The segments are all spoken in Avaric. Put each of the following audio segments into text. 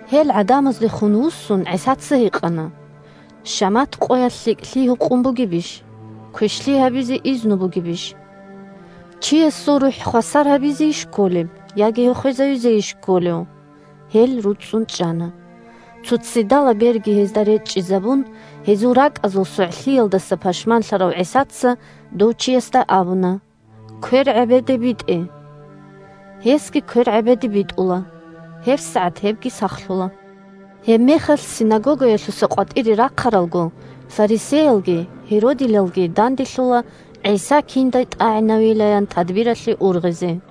Гьел гӀадамаздехун вуссун, ГӀисаца гьикъана: – Шамат къоялъ лъикӀлъи гьукъун бугебищ, квешлъи гьабизе изну бугебищ? Чиясул рухӀ хвасар гьабизейищ кколеб, яги гьев хвезавизейищ кколев? Гьел руцӀцӀун чӀана. Цо ццидалаб берги гьезда речӀчӀизабун, гьезул ракӀазул согӀлъиялдаса пашманлъарав ГӀисаца дов чиясда абуна: – Квер гӀебеде битӀе, – ян. Гьесги квер гӀебеде битӀула, гьебсагӀат гьебги сахлъула. Гьебмехалъ синагогаялъуса къватӀире рахъаралго, фарисеялги гьеродилалги данделъула ГӀиса киндай тӀагӀинавилаян тадбиралъе ургъизе.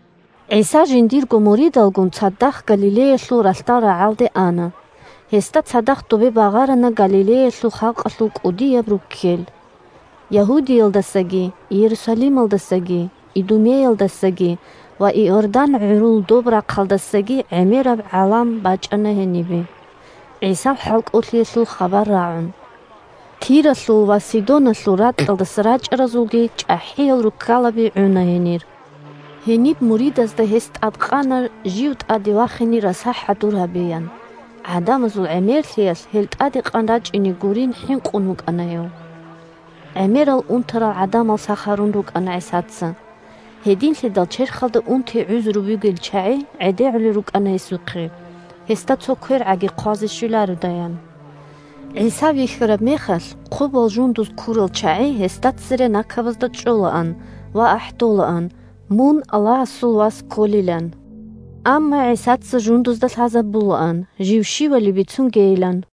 ГӀиса жиндирго муридалгун цадахъ Галилеялъул ралъдал рагӀалде ана. Гьесда цадахъ добе багъарана Галилеялъул халкъалъул кӀудияб руккел. Ягьудиялдасаги, Иерусалималдасаги, Идумеялдасаги ва Иордан гӀурул доб рахъалдасаги гӀемераб гӀалам бачӀана гьенибе, ГӀисал хӀалкӀолъиялъул хабар рагӀун. Тиралъул ва Сидоналъул ракьалдаса рачӀаразулги чӀахӀиял руккалаби гӀуна гьенир. Гьениб муридазда гьес тӀадкъана жив тӀаде вахине раса хӀадур гьабеян: гӀадамазул гӀемерлъиялъ, гьел тӀаде къан рачӀине гурилан хӀинкъун вукӀана гьев. ГӀемерал унтарал гӀадамал сах гьарун рукӀана ГӀисаца, гьединлъидал черхалда унти-гӀузру бугел чагӀи гӀедегӀулел рукӀана гьесухъе, гьесда цо квергӀаги хъвазе щвелародаян. ГӀиса вихьараб мехалъ, хъубал жундуз ккурал чагӀи гьесда цере накабазда чӀолаан ва ахӀдолаан, мун Аллагьасул Вас кколилан. Амма ГӀисаца жундузда лъазабулаан жив щивали бицунгейилан.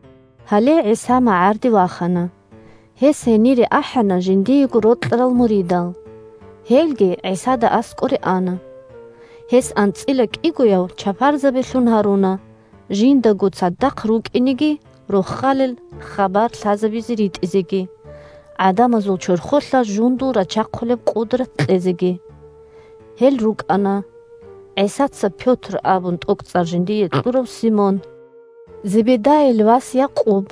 Гьале ГӀиса магӀарде вахана. Гьес гьенире ахӀана жиндиего рокьарал муридал. Гьелги ГӀисада аскӀоре ана. Гьес анцӀила кӀигояв чапарзабилъун гьаруна, жиндаго цадахъ рукӀинеги, Рохалил хабар лъазабизе ритӀизеги, гӀадамазул чорхолъа жундул рачахъулеб къудрат кьезеги. Гьел рукӀана: ГӀисаца Пётр абун тӀокӀцӀар жиндие кьурав Симон, Зебедайил вас Якъуб,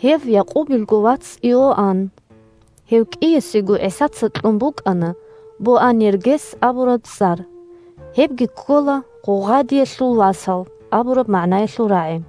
гьев Якъубилго вац Иоанн (гьев кӀиясего ГӀисаца кьун букӀана Боанергес абураб цӀар – гьебги ккола «Гъугъадиялъул васал» абураб магӀнаялъул рагӀи),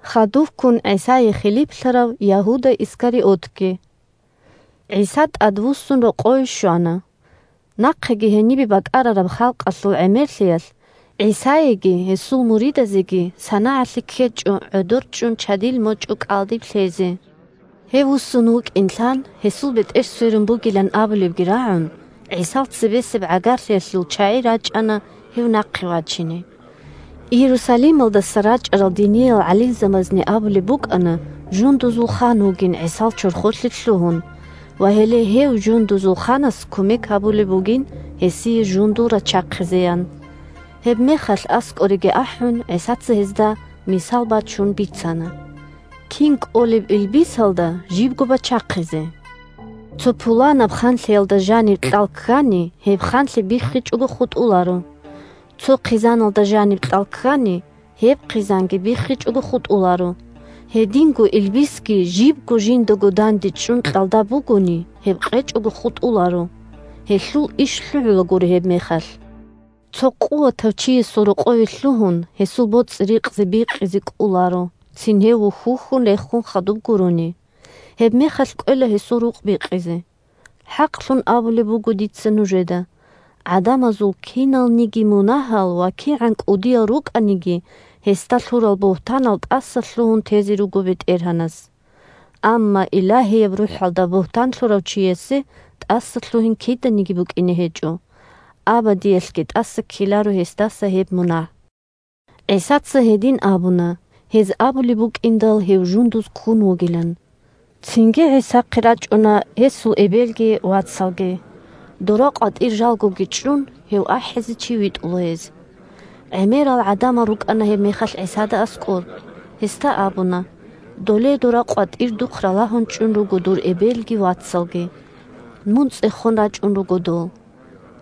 хадув ГӀисае хилиплъарав Ягьуда Искариотги. ГӀиса тӀадвуссун рокъове щвана. Нахъеги гьенибе бакӀарараб халкъалъул гӀемерлъиялъ, ГӀисаеги гьесул муридазеги санагӀалъи ккечӀо гӀодорчӀун чадил мочӀу кӀалдиб лъезе. Гьев вуссун вукӀин лъан, гьесул бетӀер сверун бугилан абулебги рагӀун, ГӀисал цебесеб гӀагарлъиялъул чагӀи рачӀана гьев нахъе вачине. Иерусалималдаса рачӀарал диниял гӀалимзабазни абулеб букӀана жундузул хан вугин ГӀисал чорхолъе лъугьун, ва гьеле гьев жундузул ханас кумек гьабулеб бугин гьесие жундул рачахъизеян. Гьебмехалъ аскӀореги ахӀун, ГӀисаца гьезда, мисал бачун, бицана: – Кин кӀолеб илбисалда жибго бачахъизе? Цо пуланаб ханлъиялда жаниб кьал ккани, гьеб ханлъи биххичӀого хутӀуларо. Цо хъизаналда жаниб кьал ккани, гьеб хъизанги биххичӀого хутӀуларо. Гьединго илбисги жибго жиндаго дандечӀун кьалда бугони, гьеб къечӀого хутӀуларо. Гьелъул иш лъугӀулагури гьебмехалъ. Цо къуватав чиясул рокъове лъугьун, гьесул боцӀи-рикъзи бикъизе кӀоларо, цин гьев вухь-вухьун рехун хадуб гурони. Гьебмехалъ кӀвела гьесул рукъ бикъизе. ХӀакълъун абулеб буго дица нужеда: гӀадамазул киналниги мунагьал ва кигӀан кӀудиял рукӀаниги гьесда лъурал бугьтанал тӀасалъугьун тезе руго БетӀергьанас. Амма Илагьияб РухӀалда бугьтан лъурав чиясе тӀасалъугьин киданиги букӀине гьечӀо. Абадиялъги тӀаса ккеларо гьесдаса гьеб мунагь. (ГӀисаца гьедин абуна, гьез абулеб букӀиндал гьев жундуз ккун вугилан.) Цинги ГӀисахъе рачӀуна гьесул эбелги вацалги. Дора къватӀир жалгоги чӀун, гьев ахӀизе чи витӀула гьез. ГӀемерал гӀадамал рукӀана гьебмехалъ ГӀисада аскӀор. Гьесда абуна: – Доле дора къватӀир духъ ралагьун чӀун руго дур эбелги вацалги. Мун цӀехон рачӀун руго дол.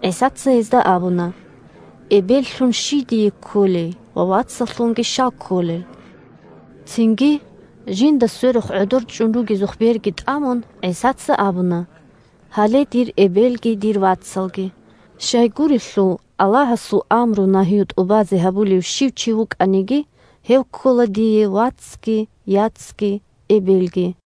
ГӀисаца гьезда абуна: – Эбеллъун щий дие кколей ва вацаллъунги щал кколел? Цинги жинда сверухъ гӀодор чӀун ругезухъ берги тӀамун, ГӀисаца абуна: – Гьале дир эбелги дир вацалги. Щайгурелъул Аллагьасул амру-нагью тӀубазе гьабулев чи щив вукӀаниги, гьев ккола дие вацги, яцги, эбелги.